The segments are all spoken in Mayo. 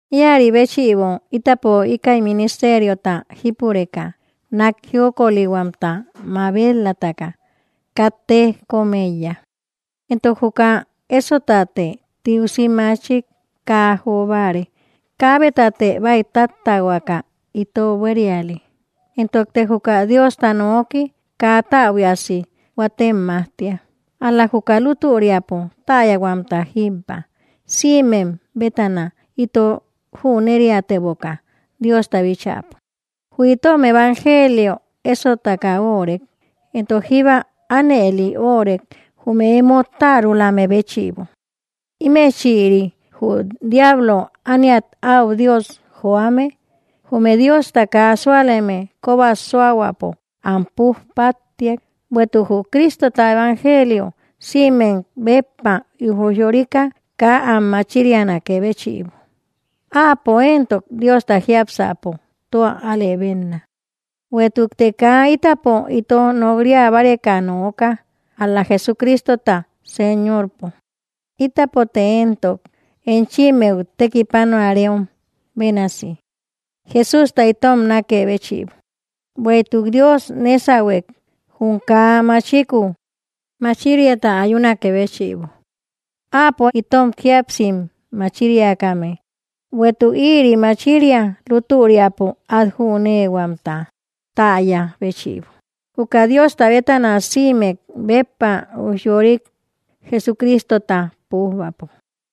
Ïaribéchïbo itapo íkäi ministeriota jípureka, nak jiokolihuamta mabet‑lataka katte kom eiya. Entok juka esotatë tiusi machik kaa jobare, kabetate baïtattähuaka ito buériale, entokte juka Diosta nooki kaa täbuiasi huatem majtia, ál‑la juka lutüriapo täyahuamta jíbba, sïmem bétana ito jüneriateboka Diosta bíchäpo. Jü itom evangelio ésotaka órek, entok jíba anëli órek jume emo tärulame béchïbo. Imechïri, jü diablo ániat au dios joame, jume Diosta kaa súaleme koba suahuäpo am puj pattiak, bueïtuk jü Cristota evangelio sïmek béppa ujyorika kaa am machirianakë béchïbo; áapo entok Diosta jiápsäpo tua alëbenna. Bueïtukte kaa itapo ito nokriabareka nooka, ál‑la Jesucristota Señorpo, ítapote entok enchimmeu tekipanuareom bénasi, Jesústa itom nakë béchïbo. Bueïtuk Dios nesahuek, jum kaa machiku machiriata ayunakë béchïbo, áapo itom jíapsim machiriakame, bueïtuk ïri machiria lutüriapo at jünehuamta täya béchïbo, juka Diosta bétana sïmek béppa ujyorik, Jesucristota pujbäpo.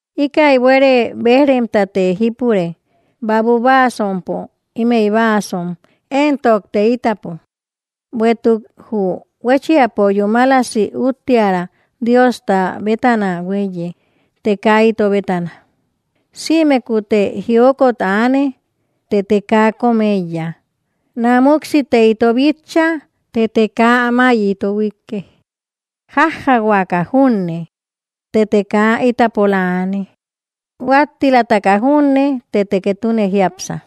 Íkäi buere bejremtate jípure babu báasompo imey báasom entokte itapo, bueïtuk jü huéchiapo yúmalasi uttiära Diosta bétana huéiye të kaa ito bétana. Sïmekutte jiokot aane, tëte kaa kom eiya, námuksite ito bitcha, tëte kaa amay ito huiike. Jájjahuaka junne tëte kaa itapola aane, huattilataka junne tëte ketune jiápsa.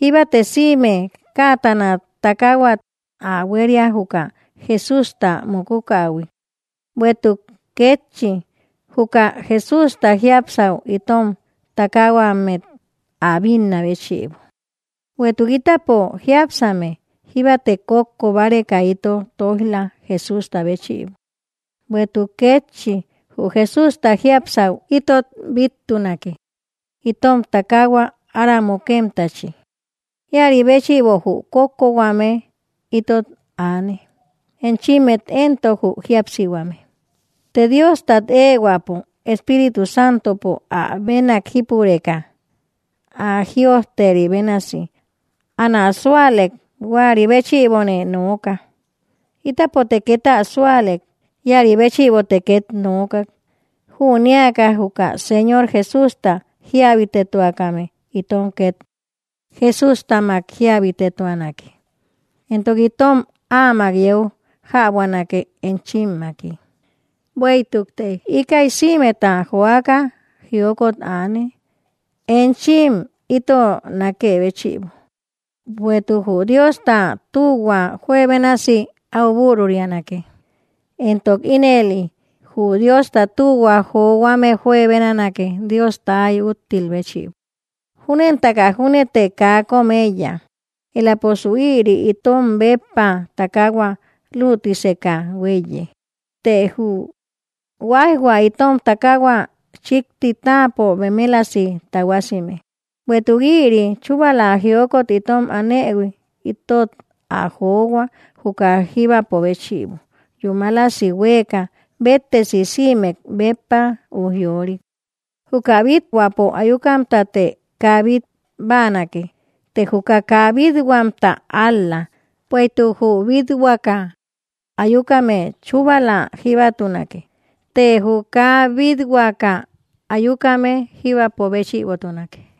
Jíbate sïme kätana takahuat ä huéria juka Jesústa mukukähui, bueïtuk kétchi juka Jesústa jiápsau itom takahuammet ä binná béchïbo. Bueïtuk itapo jiápsame, jíbate kókko bareka ito toijla Jesústa béchïbo, bueïtuk kétchi jü Jesústa jiapsäu itot bittunake itom takahua ára mukemtachi. Ïaribéchïbo jü kókko huame itot aane, enchimmet entok jü jíapsihuame. Të Diostat ehuäpo Espíritu Santopo áabenak jípureka, ä: “Jïojteri bénasi anä sualek, huäri béchïbone nooka”; ítapote ket ä sualek, iäribéchïbote ket nookak. Jüneaka juka Señor Jesústa jiabitetuakame, itom ket Jesustamak jiabitetuanake, entok itom áamak yeu jäbuanake enchimmaki. Bueïtukte íkäi sïmeta joaka jiokot aane, enchim ito nakë béchïbo, bueïtuk jü Diosta tühua juebénasi au bürurianake, entok ínëli jü Diosta tühua johuame juebenanake Diosta ay úttil béchïbo. Júnentaka júnete kaa kom eiya, elaposu ïri itom béppa takahua lütiseka huéiye, të jü huaijhua itom takahua chikti táapo bemelasi tahuasime. Bueïtuk ïri chubala jiokot itom anëhui, itot ä johua juka jíbapo béchïbo yúmalasi hueka béttesi sïmek béppa ujyorik. Juka bíthuäpo ayukamtate kaa bít báanake, të juka kaa bít-huamta ál‑la; bueïtuk jü bíthuäka ayukame chubala jíbatunake, të jü kaa bithuäka ayukame jíbapo béchïbotunake.